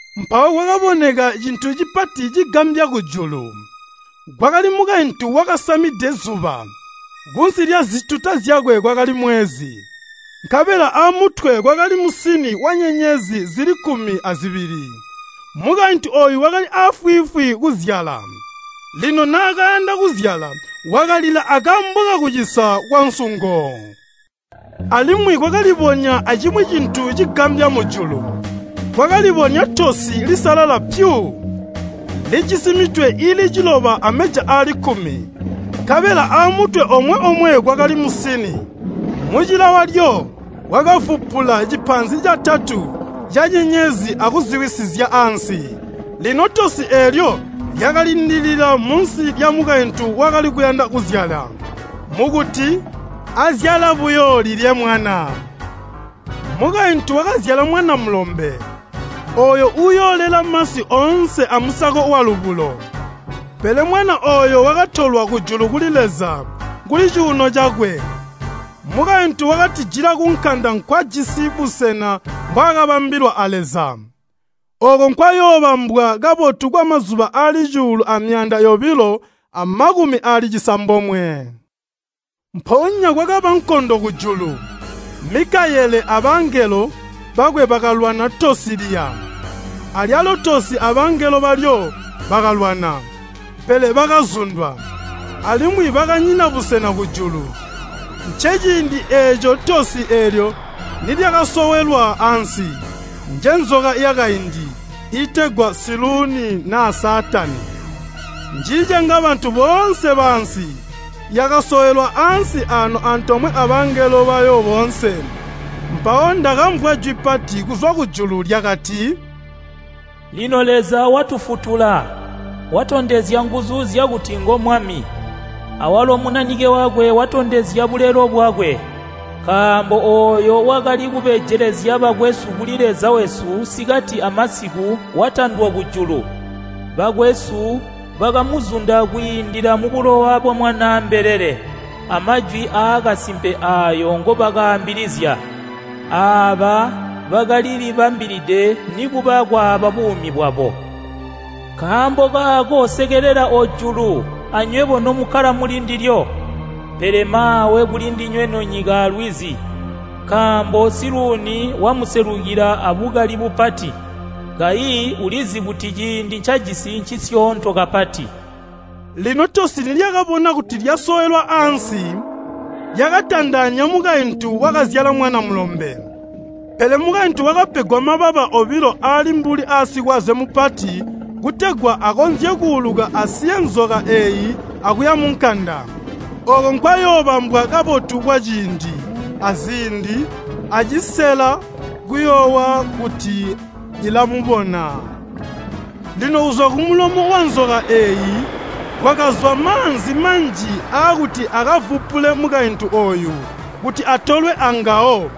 Mpawo kwakaboneka cintu cipati cigambya kujulu. Kwakali mukaintu wakasamide zuba. Kunsi lyazituta zyakwe kwakali mwezi, nkabela amutwe kwakali musini wanyenyezi zili kkumi azibili. Mukaintu ooyu wakali aafwiifwi kuzyala, lino naakayanda kuzyala wakalila akaambo kakucisa kwansungo. Alimwi kwakalibonya acimwi cintu cigambya mujulu. Kwakalibonya tosi lisalala pyu, lijisi mitwe iili ciloba ameja aali kkumi. Nkabela aamutwe omwe-omwe kwakali musini. Mucila walyo wakavupula cipaanzi catatu canyenyezi akuziwisizya ansi. Lino tosi eelyo lyakalindilila munsi lyamukaintu wakali kuyanda kuzyala, mukuti azyala buyo lilye mwana. Mukaintu wakazyala mwana mulombe, ooyo uuyoolela masi oonse amusako walubulo, pele mwana ooyo wakatolwa kujulu kuli Leza kuli cuuno cakwe. Mukaintu wakatijila kunkanda nkwajisi busena mbwaakabambilwa a Leza, ooko nkwayoobambwa kabotu kwamazuba aali cuulu amyaanda yobilo amakumi aali cisambomwe. Mpoonya kwakaba nkondo kujulu. Mikayele abangelo bakwe bakalwana tosi liya. Alyalo tosi abangelo balyo bakalwana, pele bakazundwa, alimwi bakanyina busena kujulu. Nceciindi eeco tosi eelyo nilyakasowelwa ansi, njenzoka yakaindi, iitegwa Siluuni naa Saatani, njiicenga bantu boonse baansi. Yakasowelwa ansi aano antoomwe abangelo bayo boonse. Mpawo ndakamvwa jwi pati kuzwa kujulu lyakati, “Lino Leza watufutula! Watondezya nguzu zyakuti ngo Mwami. Awalo Munanike wakwe watondezya bulelo bwakwe! Nkaambo ooyo wakali kubejelezya bakwesu kuli Leza wesu sikati amasiku watandwa kujulu. Bakwesu bakamuzunda kwiindila mubulowa bwa Mwanaa mbelele amajwi aakasimpe aayo ngobakaambilizya. Aaba bakalilibambilide nikuba kwaaba buumi bwabo. Nkaambo kaako sekelela ojulu anywebo nomukkala muli ndilyo! Pele maawe kuli ndinywe nonyika alwizi! Nkaambo Siluuni wamuselukila abukali bupati, kayi ulizi kuti ciindi ncacijisi ncisyoonto kapati.” Lino tosi nilyakabona kuti lyasowelwa ansi, lyakatandaanya mukaintu wakazyala mwana mulombe. Pele mukaintu wakapegwa mababa obilo aali mbuli aasikwaze mupati kutegwa akonzye kuuluka asiye nzoka eeyi akuya munkanda, ooko nkwayoobambwa kabotu kwaciindi, aziindi, acisela kuyoowa kuti ilamubona. Lino kuzwa kumulomo wanzoka eeyi kwakazwa maanzi manji aakuti akavupule mukaintu ooyu kuti atolwe angawo.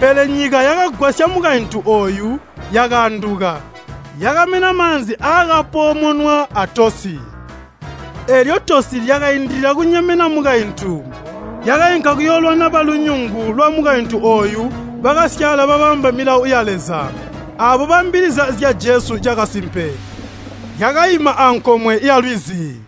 Pele nyika yakagwasya mukaintu ooyu, yakaanduka, yakamena maanzi aakapoomonwa a tosi. Eelyo tosi lyakaindilila kunyemena mukaintu, lyakainka kuyoolwana balunyungu lwamukaintu ooyu bakasyaala babamba milawo ya Leza, aabo baambilizya zya Jesu cakasimpe. Lyakaima ankomwe yalwizi.